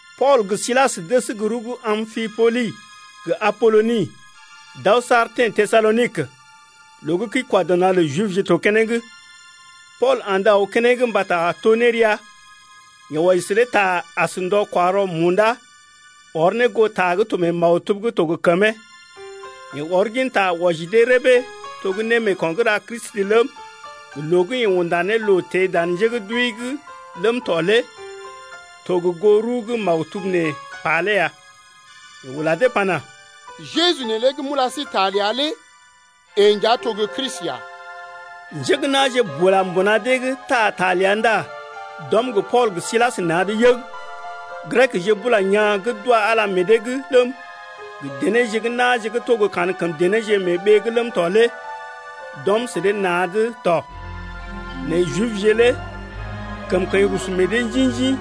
Pool gə Silas dəs gə rəw gə́ Ampipolis gə Apoloni d’aw saar teḛ Tesalonik, loo gə́ kəi-kwa-dɔ-na̰ lə Jibje to keneŋ. Pool andə aw keneŋ mbata to nérea. Yeḛ wɔji sə dee ta as ndɔ-kwa-rɔ munda, ɔr ne goo ta gə́ to mee maktub’g gə́ to gə kəmee. Yeḛ ɔr ginta wɔji dee rəbee to gə́ némeeko̰ gə́ ra Kristi ləm, gə loo gə́ yeḛ unda ne loo teḛ dan njé gə́ d’wəi’g ləm tɔ lé to gə goo rəw gə́ maktub nee pa lé ya. Yeḛ ula dee pana: Jeju neelé gə́ m’ula sí ta ləa lé yeḛ nja to gə́ Kristi lé ya. Njé gə́ na̰je mbuna dee’g taa ta ləa ndá d’ɔm gə Pool gə Silas na̰’d yəg. Grekje bula yaa̰ gə́ d’wa Ala meḛ dee’g ləm, gə denéje gə́ na̰je gə́ to gə́ kankəm denéje mee ɓee’g ləm tɔ lé d’ɔm sə dee na̰’d tɔ. Nɛ Jibje lé kəmkəḭ rusu meḛ dee njḭ-njḭ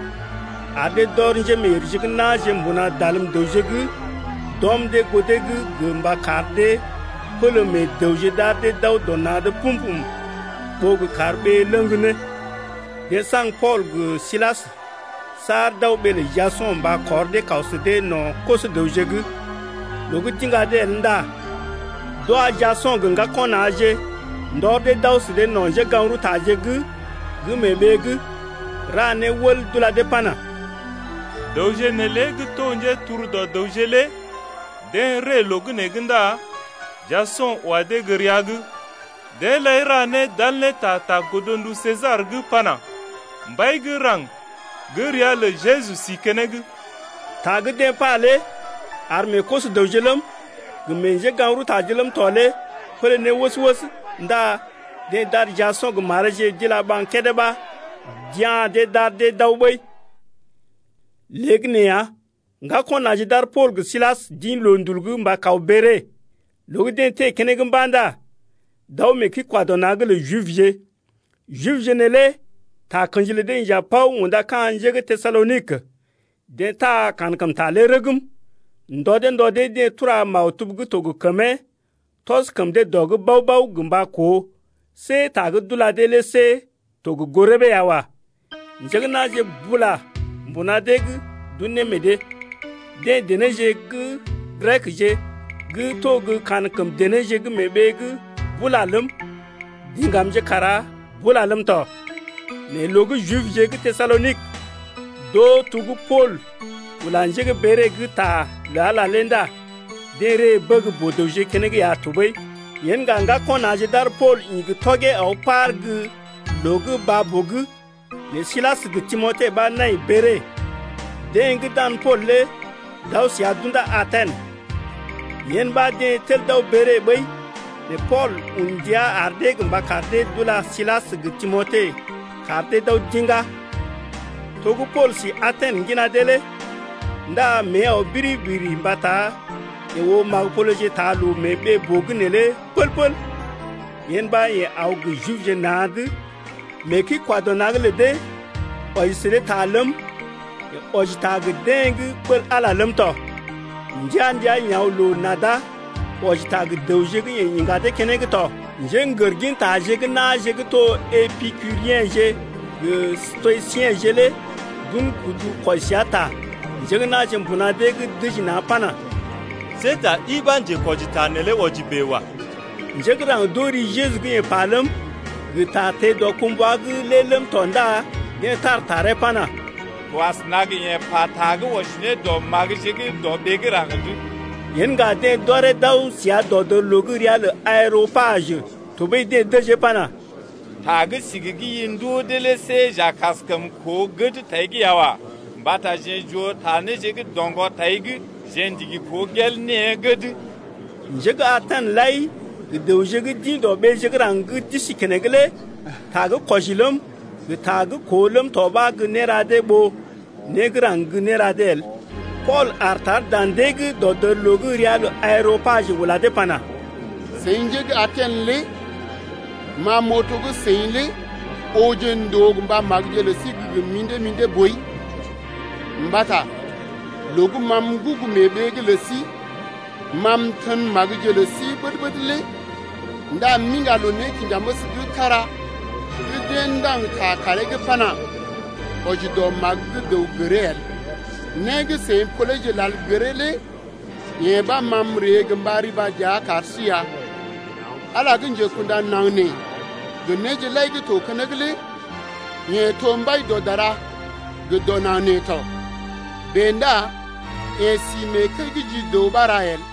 ar dee d’ɔr njémeeyèrje gə́ na̰je mbuna dalm-dəwje’g d’ɔm dee goo dee’g gə mba kar dee pələ meḛ dəwje d’ar dee d’aw dɔ na̰’d pum-pum ɓó gə kar ɓee ləŋg ne. Deḛ saŋg Pool gə Silas saar d’aw ɓee lə Jaso̰ mba kɔr dee kaw sə dee no̰ koso-dəwje’g. Loo gə́ d’iŋga dee el ndá d’wa Jaso̰ gə ŋgako̰ na̰je ndɔr dee d’aw sə dee no̰ njégaŋ-rəwtaje’g gə́ mee ɓee’g, ra né wəl d’ula dee pana: Dəwje neelé gə́ to njéturu dɔ dəwje lé deḛ ree loo gə́ nee’g ndá Jaso̰ wa dee gə́ rəa’g. Deḛ lai ra né d’al ne ta ta godndu Sesar’g pana: Mbai gə́ raŋg gə́ ria lə Jeju sí keneŋ. Ta gə́ deḛ pa lé ar meḛ koso-dəwje ləm, gə meḛ njégaŋ-rəwtaje ləm tɔ lé pélé ne wəs-wəs, ndá deḛ d’ar Jaso̰ gə mareeje d’uga ɓaŋg kédé ɓa d’ya̰ dee d’ar dee d’aw ɓəi. Léegəneeya ŋgako̰ na̰je d’ar Pool gə Silas d’ḭ loondul’g mba kaw Bere. Loo gə́ deḛ teḛ keneŋ mba̰ ndá d’aw mee kəi-kwa-dɔ-na̰’g lə Jibje. Jibje neelé takə̰ji lə dee inja paw unda ka̰ njé gə́ Tesalonik, deḛ taa kankəmta lé rəgm gə ndɔ dee ndɔ dee. Deḛ tura maktub gə́ to gə kəmee tɔs kəm dee dɔ’g bao-bao gə mba koo see ta gə́ d’ula dee lé see to gə goo rəbee ya wa. Njé gə́ na̰je bula mbuna dee’g d’un ne meḛ dee, deḛ denéje gə́ Grekje gə́ to gə́ kankəm denéje gə́ mee ɓee’g bula ləm, diŋgamje kara bula ləm tɔ. Nɛ loo gə́ Jibje gə́ Tesalonik d’oo to gə́ Pool ula njé gə́ Bere’g ta lə Ala lé ndá deḛ ree bəg boo-dəwje keneŋ ya tɔɓəi. Yen ŋga ŋgako̰ na̰je d’ar Pool ḭ gə tɔgee aw par gə́ gə loo gə́ baa-boo’g, nɛ Silas gə Timote ɓa nai Bere. Deḛ gə́ dan Pool lé d’aw səa d’unda Aten. Yen ɓa deḛ tel d’aw Bere ɓəi nɛ Pool un ndia ar dee gə mba kar dee d’ula Silas gə Timote kar dee d’aw d’iŋgá. To gə́ Pool si Aten ŋgina dee lé ndá mée aw biriri-biriri mbata yeḛ oo magə-poleje taa loo mee ɓee-boo’g neelé pəl-pəl. Yen ɓa yeḛ aw gə Jibje na̰’d mee kəi-kwa-dɔ-na̰’g lə dee wɔji sə dee ta ləm, yeḛ wɔji ta gə deḛ gə́ ɓəl Ala lé ləm tɔ. Ndəa-ndəa yeḛ aw loo-nada wɔji ta gə dəwje gə́ yeḛ iŋga dee keneŋ tɔ. Njégər gintaje gə́ na̰je gə́ to Epikuriḛje gə Stoisiḛje lé d’un kudu kwɔji səa ta. Njé gə́ na̰je mbuna dee’g dəji na̰ pana: See ta ɗi ɓa njetakwɔji neelé wɔji bèe wa. Njé gə́ raŋg d’oo ri Jeju gə́ yeḛ pa ləm, gə ta teḛ dɔkumbwa’g lé ləm tɔ ndá deḛ tar taree pana: To asəna gə yeḛ pata gə́ wɔji ne dɔ magəje gə́ dɔ ɓee gə́ raŋg’d. Yen ŋga deḛ d’ɔree d’aw səa dɔdərloo gə́ ria lə Areopajə, tɔɓəi deḛ dəjee pana: Ta gə́ sigi gə́ i ndoo dee lé see j’a kaskəm koo gəd tai’g ya wa. Mbata jeḛ j’oo ta néje gə́ doŋgɔ tai’g. Jeḛ ndigi koo gel née gəd. (Njé gə́ Aten lai gə dəwje gə́ d’ḭ dɔ ɓeeje gə́ raŋg gə́ d’isi keneŋ lé ta gə́ kwɔji ləm, gə ta gə́ koo ləm tɔ ɓa gə́ néra dee ɓó né gə́ raŋg gə́ néra dee el.) Pool aar tar dan dee’g dɔdərloo gə́ ria lə Areopajə ula dee pana: Seḭ njé gə́ Aten lé ma m’oo to gə́ seḭ lé ooje ndòo gə mba magəje lə sí gə́ gə mḭdé-mḭdé boi. Mbata loo gə́ ma m’gugu mee ɓee’g lə sí ma m’tən magəje lə sí ɓəd-ɓəd lé ndá m’iŋga loo-nékinjaməs gə́ kára gə́ deḛ ndaŋg ta kaaree’g pana: Wɔji dɔ magə gə́ dəw gəree el. Né gə́ seḭ poleje lal gəree lé yee ɓa ma m’ree gə mba riba dəa kar sí ya. Ala gə́ njekunda naŋg nee gə néje lai gə́ to keneŋ lé yeḛ to Mbai dɔ dara gə dɔ naŋg nee tɔ. Bèe ndá yeḛ si mee kəi gə́ ji dəw ɓa ra el.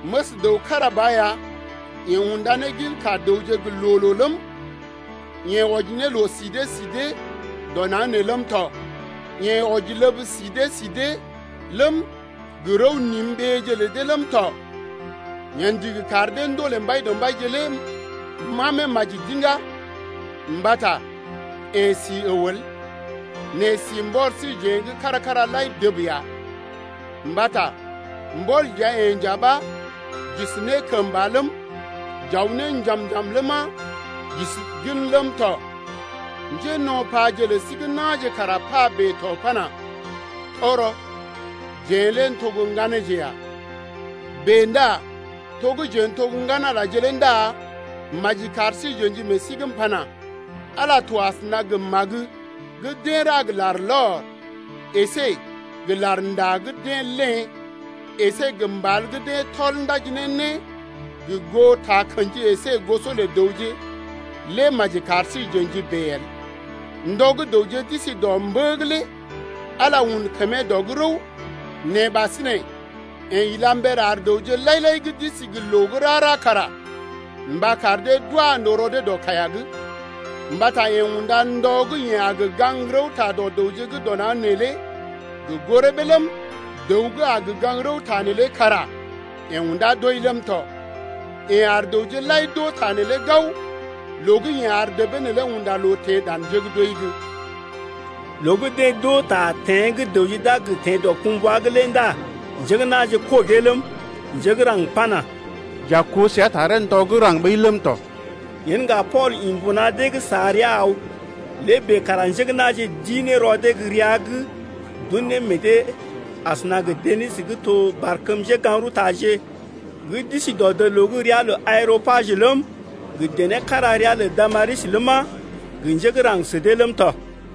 Məs dəw kára ba ya yeḛ unda ne ginka dəwje gə́ loo-loo ləm, yeḛ wɔji ne loo-si dee si dee dɔ naŋg nee ləm tɔ. Yeḛ wɔji ləb si dee si dee ləm, gə rəw-nim ɓeeje lə dee ləm tɔ. Yeḛ ndigi kar dee ndolè Mbaidɔmbaije lé mamee maji d’iŋgá, mbata yeḛ si əw el, nɛ si mbɔr síjeḛ kára-kára lai dəb ya. Mbata mbɔl dəa-yeḛ nja ɓa j’isi ne kəmba ləm, j’aw ne njam-njam ləma, j’isi gən ləm tɔ. Njéno̰paje lə sí gə́ na̰je kara pa bèe to pana: Tɔgərɔ, jeḛ lé n’to gə́ ŋganeeje ya. Bèe ndá to gə́ jeḛ n’to ŋgan-Alaje lé ndá maji kar sí j’ə̰ji meḛ sí’g m’pana: Ala to asəna gə magə gə́ deḛ ra gə larlɔr əsé gə larnda gə́ deḛ léḛ əsé gə mbal gə́ deḛ tɔl ndaji ne né gə goo takə̰ji əsé goso lə dəwje lé maji kar sí j’ə̰ji bèe el. Ndɔ gə́ dəwje d’isi dɔ mbə’g lé Ala un kəmee dɔ’g rəw. Nɛ ɓasinè yeḛ ila mber ar dəwje lai-lai gə́ d’isi gə loo gə́ rara kara mba kar dee d’wa ndòo rɔ dee dɔ kaiya’g, mbata yeḛ unda ndɔ gə́ yeḛ a gə gaŋg rəwta dɔ dəwje gə́ dɔ naŋg neelé gə goo rəbee ləm, dəw gə́ a gə gaŋg rəwta neelé kara yeḛ unda doi ləm tɔ. Yeḛ ar dəwje lai d’oo ta neelé gao loo gə́ yeḛ ar debee neelé unda loo teḛ dan njé gə́ d’wəi’g. Loo gə́ deḛ d’oo ta teḛ gə́ dəwje d’a gə teḛ dɔkumbwa’g lé ndá njé gə́ na̰je kɔgee ləm, njé gə́ raŋg pana: J’a koo səa taree ndɔ gə́ raŋg ɓəi ləm tɔ. Yen ŋga Pool ḭ mbuna dee’g sa rəa aw. Lé bèe kara njé gə́ na̰je dii ne rɔ dee gə rəa’g d’un ne meḛ dee asəna gə Deni gə́ to barkəm njégaŋ-rəwtaje gə́ d’isi dɔdərloo gə́ ria lə Areopajə ləm, gə dené kára ria lə Damaris ləma, gə njé gə́ raŋg sə dee ləm tɔ.